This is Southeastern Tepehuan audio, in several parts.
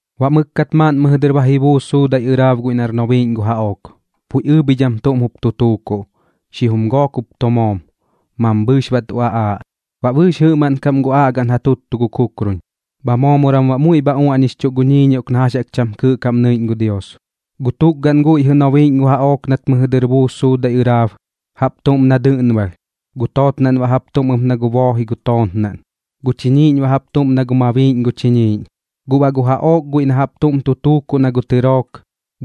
Baꞌ mɨkkat maaꞌn mɨjɨ dɨr ba ji buus suudaiꞌ ɨraab guiꞌ nar nobiiꞌñ gu jaꞌook, puiꞌ ɨɨbhidham tuꞌm jup tu tuukuꞌ, xijum gook jup tu moom, mambhɨɨx baꞌ tu aꞌaaꞌ. Baꞌ bɨɨx jɨꞌmaꞌn kaꞌm gu aꞌgaꞌn ja tuttutuꞌ gu kukrun, bha moomoram baꞌ muiꞌ bha uaꞌñixchuꞌ gu ñiiñioꞌk na jax jaꞌk cham kɨɨꞌ kaꞌm nɨiꞌñ gu Dios. Gu tukgaꞌn guiꞌ jɨꞌ nobiiꞌñ gu jaꞌook nat mɨjɨ dɨr ji buus suudaiꞌ ɨraab, jaꞌp tuꞌm na dɨꞌnbalh, gu tootnaꞌn baꞌ jaꞌp tuꞌm ɨp na gu booji gu tootnaꞌn, gu chiñiiꞌñ baꞌ jaꞌp tuꞌm na gu mabiiꞌñ gu chiñiiꞌñ. Guꞌ baꞌ gu jaꞌook guiꞌ na jaꞌp tuꞌm jup tu tuukuꞌ na gu tɨrook,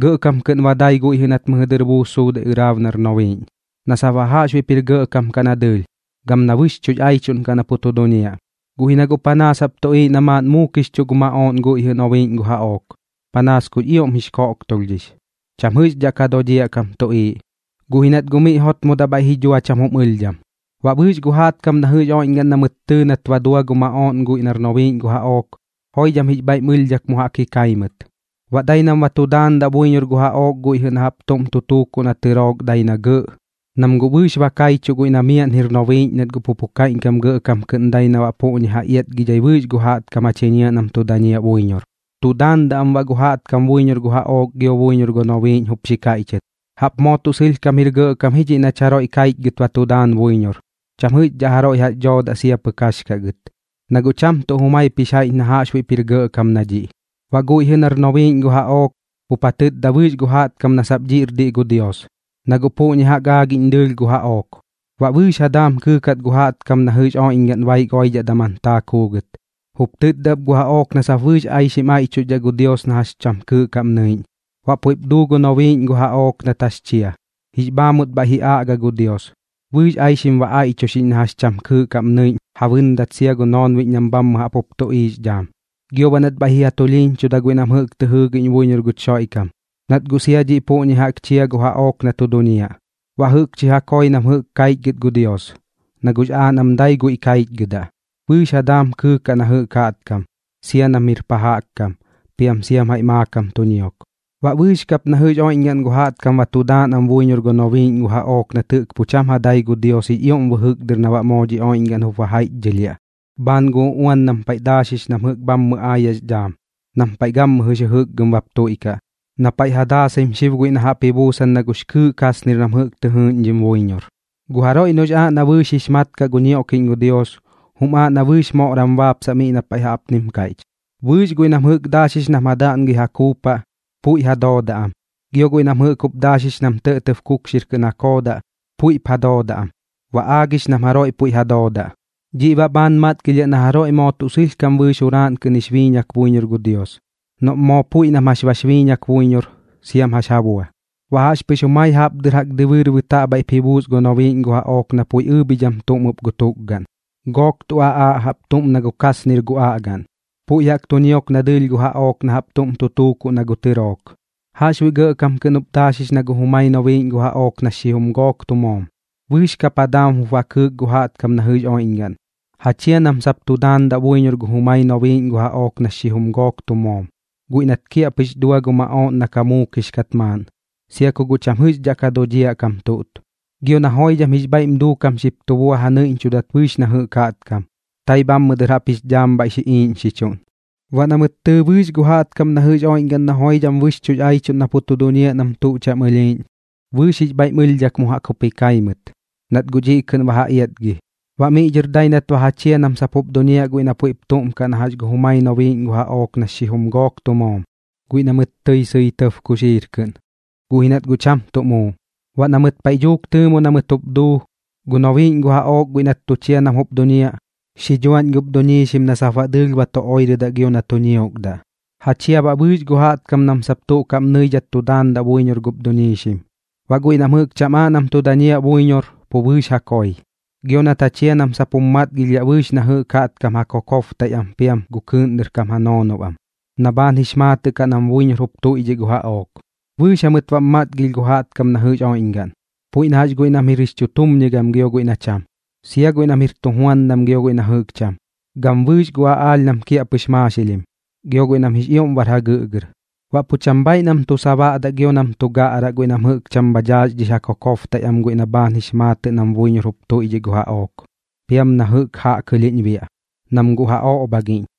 gɇꞌkam kɨꞌn ba dai guiꞌ jɨꞌ nat mɨjɨ dɨr buus suudaiꞌ ɨraab nar nobiiꞌñ, na sap baꞌ jaꞌxbuiꞌp bar gɇꞌkam kaꞌ na dɨɨlh, gam na bɨxchuꞌx aichuꞌn na pu tu duñiaꞌ. Guꞌ ji na guꞌ panaas jaꞌp tuꞌiiꞌ na maaꞌn muukixchuꞌ gu maꞌooꞌn guiꞌ jɨꞌ nobiiꞌñ gu jaꞌook, panaas kux ioꞌm jix koꞌktolhdhix, cham jɨꞌxdhaꞌ ka dodhiaꞌ kam tuꞌiiꞌ, guꞌ ji nat guꞌ miꞌ jotmodaꞌ bhaiꞌ ji dhua cham jum ɨlhdham. Baꞌ bɨɨx gu jaꞌtkam na jɨꞌx oiꞌñgaꞌn na mɨt tɨɨ nat ba dua gu maꞌooꞌn guiꞌ nar nobiiꞌñ gu jaꞌook, joidham jix bhaiꞌm ɨlhdhak mu jaꞌk ji kai mɨt. Baꞌ dai nam ba tu daandaꞌ buiñor gu jaꞌook guiꞌ na jaꞌp tuꞌm tu tuukuꞌ na gu tɨrook dai na gɇꞌ, nam guꞌ bɨɨx ba kaichuꞌ guiꞌ na miaꞌn jir nobiiꞌñ nat pu pu kaiꞌñkam gɇꞌkam kɨꞌn dai na baꞌ puꞌñi ja iatgidhai bɨɨx gu jaꞌtkam ja chiñiaꞌ nam tu dañiaꞌ buiñor. Tu daandaꞌ am baꞌ gu jaꞌtkam buiñor gu jaꞌook gio buiñor gu nobiiꞌñ jup xi kaiꞌchɨt: ―¡Jaꞌp moo tuꞌ sɨlhkam jir gɇꞌkam ji dhiꞌ nach jaroiꞌ kaichgɨt ba tu daan buiñor! Cham jɨꞌxdhaꞌ jaroiꞌ jax dhoodaꞌ sia pɨk jax kaꞌ gɨt, na guꞌ cham tuꞌ jumaip jaiꞌch na jaꞌxbuiꞌp jir gɇꞌkam na dhiꞌ. Baꞌ guiꞌ jɨꞌ nar nobiiꞌñ gu jaꞌook jup ja tɨtda bɨɨx gu jaꞌtkam na sap dhiꞌr diꞌ gu Dios, na guꞌ puꞌñi jaꞌk aagiꞌñ dɨɨlh gu jaꞌook. Baꞌ bɨɨx ja daam kɨɨkat gu jaꞌtkam na jɨꞌx oiꞌñgaꞌn baik oidhaꞌ daman taak juugɨt. Jup tɨtda ɨp gu jaꞌook na sap bɨɨx aixim aiꞌchuxdhaꞌ gu Dios na jax cham kɨɨꞌ kaꞌm nɨiꞌñ. Baꞌ puiꞌp duu gu nobiiꞌñ gu jaꞌook nat jax chia, jix bhaamut bhaiꞌ ji aꞌga gu Dios, bɨɨx aixim ba aiꞌchuxiꞌñ na jax cham kɨɨꞌ kaꞌm nɨiꞌñ ja bɨndat sia gu noonbiꞌñ nam bhammɨ jaꞌp jup tuꞌiiꞌx dhaam. Gio baꞌ nat bhaiꞌ ji ja tulhiiñchuda guiꞌ nam jɨꞌk tɨ jɨɨgiꞌñ buiñor guch Xoiꞌkam, nat guꞌ sia dhiꞌ puꞌñi jaꞌk chia gu jaꞌook na tu duñiaꞌ. Baꞌ jɨꞌkchi ja koi nam jɨꞌk kaichgɨt gu Dios, na guꞌx aaꞌ nam dai guiꞌ kaichgɨdaꞌ. Bɨɨx ja daam kɨɨkaꞌ na jɨꞌk jaꞌtkam, sia nam jir pa jaꞌk kam, piam siam jaiꞌ maakam tu ñiok. Baꞌ bɨɨx kap na jɨꞌx oiꞌñgaꞌn gu jaꞌtkam ba tu daan am buiñor gu nobiiꞌñ gu jaꞌook nat jɨꞌk pu cham ja dai gu Dios jix ioꞌm bɨjɨk dɨr na baꞌ moo dhi oiꞌñgaꞌn jup ba jaiꞌchdhɨlhiaꞌ, bhaan gu uꞌuan nam paiꞌ daaxix nam jɨꞌk bhammɨ aayaꞌx dhaam, nam paiꞌ gammɨjɨx jɨjɨkgɨm bap tuiꞌkaꞌ, na paiꞌ ja daasaim xib guiꞌ na jaꞌp ji buusan na gux kɨɨꞌ kasnir nam jɨꞌk tɨ jɨɨꞌñdhim buiñor. Gu jaroiꞌ noꞌx aaꞌ na bɨɨx jix mat kaꞌ gu ñioꞌkiꞌñ gu Dios, jum aaꞌ na bɨɨx moꞌram baapsaꞌ miꞌ na paiꞌ jaꞌpnim kaiꞌch: “Bɨɨx guiꞌ nam jɨꞌk daaxix nam ja daꞌngɨi ja kuupaꞌ, puiꞌ ja doodaꞌ am, gio guiꞌ nam jɨꞌk jup daaxix nam tɇꞌtɇb kukxir kɨꞌn ja koodaꞌ, puiꞌm jup ja doodaꞌ, ba aagix am nam jaroiꞌ puiꞌ ja doodaꞌ. Dhiꞌ baꞌ bhaan matgilhiaꞌ na jaroiꞌ moo tuꞌ sɨlhkam bɨɨx juraaꞌn kɨꞌn jix biiñak buiñor gu Dios, noꞌm moo puiꞌ nam jax bax biiñak buiñor siam jax ja bua.” Baꞌ jaꞌxpɨx jumai jaꞌp dɨr jaꞌk dɨbɨɨr bɨtaꞌ bhaiꞌp ji buus gu nobiiꞌñ gu jaꞌook na puiꞌ ɨɨbhidham tuꞌm ɨp gu tukgaꞌn, gook tu aꞌaaꞌ jaꞌp tuꞌm na gu kasnir gu aꞌgaꞌn, puiꞌ jaꞌk tu ñiok na dɨɨlh gu jaꞌook na jaꞌp tuꞌm tu tuukuꞌ na gu tɨrook. Jaꞌxbuiꞌ gɇꞌkam kɨꞌn jup daaxix na gu jumai nobiiꞌñ gu jaꞌook nax xijum gook tu moom. Bɨɨx kap ja daam jup ba kɨɨk gu jaꞌtkam na jɨꞌx oiꞌñgaꞌn, ja chia nam sap tu daandaꞌ buiñor gu jumai nobiiꞌñ gu jaꞌook nax xijum gook tu moom, guiꞌ nat kiaꞌpɨx dua gu maꞌooꞌn na ka muukix kat maaꞌn, sia ku guꞌ cham jɨꞌxdhaꞌ ka dodhiaꞌ kam tuꞌt. Gio na joidham jix bhaiꞌm duukam xip tu bua ja nɨiꞌñchudat bɨɨx na jɨꞌk jaꞌtkam, tai bhammɨ dɨr jaꞌp jix dhaam bhaiꞌ ji iiꞌñxichuꞌn. Baꞌ na mɨt tɨɨ bɨɨx gu jaꞌtkam na jɨꞌx oiꞌñgaꞌn na joidham bɨxchuꞌx aichuꞌn na pu tu duñiaꞌ nam tuꞌ cham ɨlhiiꞌñ, bɨɨx jix bhaiꞌm ɨlhdhak mu jaꞌk jup ji kai mɨt, nat guꞌ dhiꞌ kɨꞌn ba ja iatgi. Baꞌ miꞌ dhɨr dai nat ba ja chia nam sap jup duñiaꞌ guiꞌ na puiꞌp tuꞌm kaꞌ na gu jumai nobiiꞌñ gu jaꞌook nax xijum gook tu moom, guiꞌ na mɨt tɨi sɨi tɇb kuxiir kɨꞌn, guꞌ ji nat guꞌ cham tuꞌ muu. Baꞌ na mɨt paiꞌ dhuuk tɨɨmo na mɨt jup duu, gu nobiiꞌñ gu jaꞌook guiꞌ nat tu chia nam jup duñiaꞌ, xi dhuaꞌñ gup duñiixim na sap baꞌ dɨɨlh ba tu oirɨdaꞌ gio na tu ñiokdaꞌ. Ja chia baꞌ bɨɨx gu jaꞌtkam nam sap tuꞌ kaꞌm nɨidhat tu daandaꞌ buiñor gup duñiixim. Baꞌ guiꞌ nam jɨꞌk cham aaꞌ nam tu dañiaꞌ buiñor, pu bɨɨx ja koi. Gio nat ja chia nam sap jum matgilhdhaꞌ bɨɨx na jɨꞌk jaꞌtkam ja kokobtaiꞌ am piam gu kɨɨꞌn dɨr kam ja noonob am, na bhaan jix maatɨꞌ kaꞌ nam buiñor jup tuiꞌdhiꞌ gu jaꞌook. Bɨɨx jamɨt baꞌm matgilh gu jaꞌtkam na jɨꞌx oiꞌñgaꞌn, puiꞌ na jax guiꞌ nam jir jix chutumñigam gio guiꞌ na cham, sia guiꞌ nam jir tujuandam gio guiꞌ na jɨꞌk cham, gam bɨɨx gu aꞌaalh nam kiaꞌpɨx maaxilhim, gio guiꞌ nam jix ioꞌm bar jagɨꞌgɨr. Baꞌ pu cham bhaaiꞌ nam tu sabaꞌdaꞌ gio nam tu gaꞌraꞌ guiꞌ nam jɨꞌk cham bha daaxdhix ja kokobtaiꞌ am guiꞌ na bhaan jix maatɨꞌ nam buiñor jup tuiꞌdhiꞌ gu jaꞌook piam na jɨꞌk jaꞌkɨlhiꞌñ biaꞌ, nam guꞌ ja oꞌbhagiꞌñ.